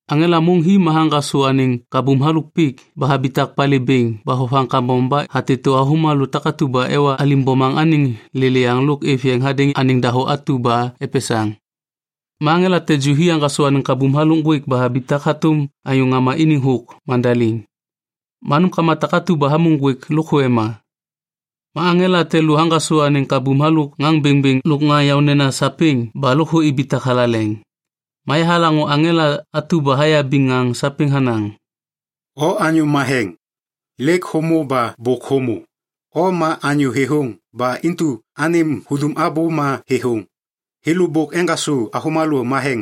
Aŋela môŋ hi ma haŋgasô anêŋ kabum halôk pik ba habitak palê bêŋ ba vovaŋ kambom ba hatêtô avômalô takatu ba ewa alim bomaŋ anêŋ lêlêyaŋ lôk êv yeŋ hadêŋ anêŋ dahô atu ba epesaŋ. Ma aŋela te ju hi haŋgasô anêŋ kabum halôk ŋgwêk ba habitak hatôm anyô ŋama iniŋ thôk mandaliŋ. Ma nômkama takatu ba êmô ŋgwêk lôkthô ema. Ma aŋela te lô haŋgasô anêŋ kabum halôk ŋaŋ bêŋbêŋ lôk ŋaŋ yaônena sapêŋ ba lôkthô ibitak thalaleŋ. Ma yahalaŋô aŋela atu ba hayabiŋ ŋaŋ sapêŋ hanaŋ, “O Anyô Matheŋ, lêk hômô ba bôk hômô. O ma anyô thêthôŋ ba intu anêm hudum abô ma thêthôŋ. Thêlô bôk eŋgasô avômalô matheŋ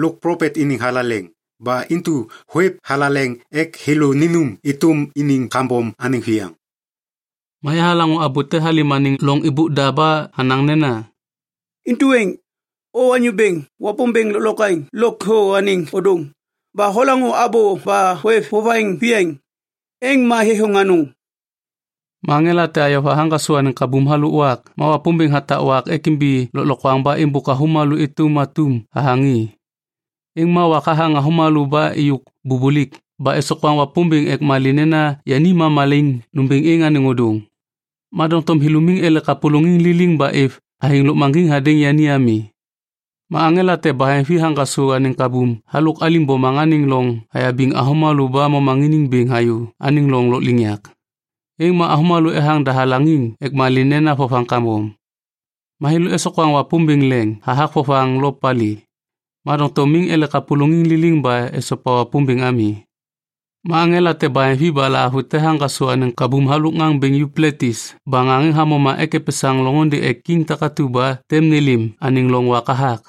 lôk plopet iniŋ thalaleŋ, ba intu hôêv thalaleŋ ek thêlô ninum êtôm iniŋ kambom anêŋ viyaŋ.” Ma yahalaŋô abô te halêm anêŋ loŋ êbôk da ba hanaŋ nena, “Intu êŋ, O Anyô Bêŋ Wapômbêŋ Lôklokwaŋ Lôkthô anêŋ Ôdôŋ, ba holaŋô abô ba hôêv vovaŋ viyaŋ, êŋ ma thêthôŋ anôŋ.” Ma aŋela te ayova haŋgasô anêŋ kabum halôk wak ma Wapômbêŋ hatak wak ek imbi lôklokwaŋ ba êmbôk avômalô êtôm atum hathaŋ i. Êŋ ma wak hathaŋ avômalô ba êyôk bubulik ba esokwaŋ Wapômbêŋ ek malê nena yani ma malaiŋ nômbêŋ êŋ anêŋ ôdôŋ. Ma doŋtom thêlô miŋ ele kapôlôŋiŋ liliŋ ba êv athêŋ lôkmaŋgiŋ hadêŋ yani ami. Ma aŋela te baheŋvi haŋgasô anêŋ kabum halôk alim bomaŋ anêŋ loŋ hayabiŋ avômalô ba momaŋiniŋ bêŋ hayô anêŋ loŋ lôkliŋyak. Êŋ ma avômalô ethaŋ dahalaŋiŋ ek malê nena vovaŋ kambom. Ma thêlô esokwaŋ Wapômbêŋ leŋ hathak vovaŋ lo palê, ma doŋtom miŋ ele kapôlôŋiŋ liliŋ ba esopa Wapômbêŋ ami. Ma aŋela te baheŋvi ba lahavute haŋgasô anêŋ kabum halôk ŋaŋ bêŋ Yupletis ba ŋaŋ êŋ hamoma ek epesaŋ loŋôndê ek kiŋ takatu ba tem nêlêm anêŋ loŋ wak hathak.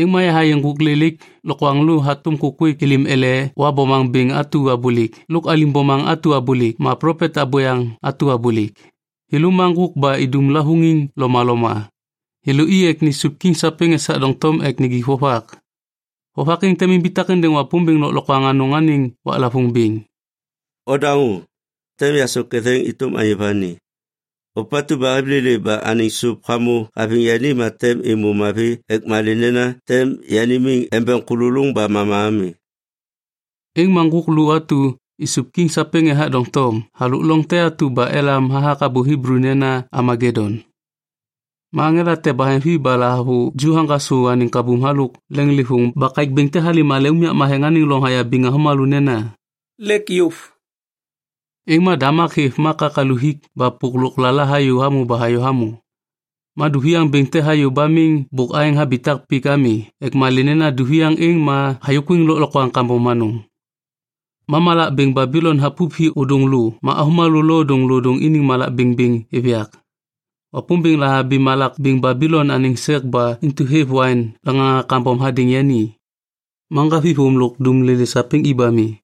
Êŋ ma yahayê ŋgôk lelaik lokwaŋlô hatôm kôkwêk êlêm ele Wa bomaŋ bêŋ atu abôlêk lôk alim bomaŋ atu abôlêk ma plopet abôyaŋ atu abôlêk. Thêlô ma ŋgôk ba idum lavôŋiŋ lomaloma. Thêlô i ek nisup kiŋ sapêŋ esak doŋtom ek nijik vovak. Vovak êŋ tem imbitak êndêŋ Wapômbêŋ Lôklokwaŋ Anôŋ anêŋ waklavôŋ bêŋ. “Odaŋô! Tem yasôk ketheŋ êtôm anyô vani. Ôpatu ba hêv lêlê ba anêŋ sôp hamô haviŋ yani ma tem êmô mavi ek malê nena tem yani miŋ embeŋ kôlôlôŋ ba mama ami.” Êŋ ma ŋgôk lô atu isup kiŋ sapêŋ ethak doŋtom halôk loŋ te atu ba elam hathak abô Hiblu nena Amagedoŋ. Ma aŋela te baheŋvi ba lahavuju haŋgasô anêŋ kabum halôk leŋlêvôŋ ba kaêk bêŋ te halêm hale unyak matheŋ anêŋ loŋ hayabiŋ avômalô nena, “Lêk yôv!” Êŋ ma damak hêv ma kakalu hik ba pôk lôklala hayô hamô ba hayô hamô. Ma duviaŋ bêŋ te hayô ba miŋ bôk aêŋ habitak pik ami ek malê nena duviaŋ êŋ ma hayôkwiŋ lôklokwaŋ kambom anôŋ. Ma malak bêŋ Babilon hapup hi ôdôŋ lô ma avômalô lodôŋlodôŋ iniŋ malak bêŋbêŋ êv yak. Wapômbêŋ lahabi malak bêŋ Babilon anêŋ sek ba intu hêv waiŋ laŋaŋa kambom hadêŋ yani. Ma ŋgavithôm lôk dumlolê sapêŋ i ba mi.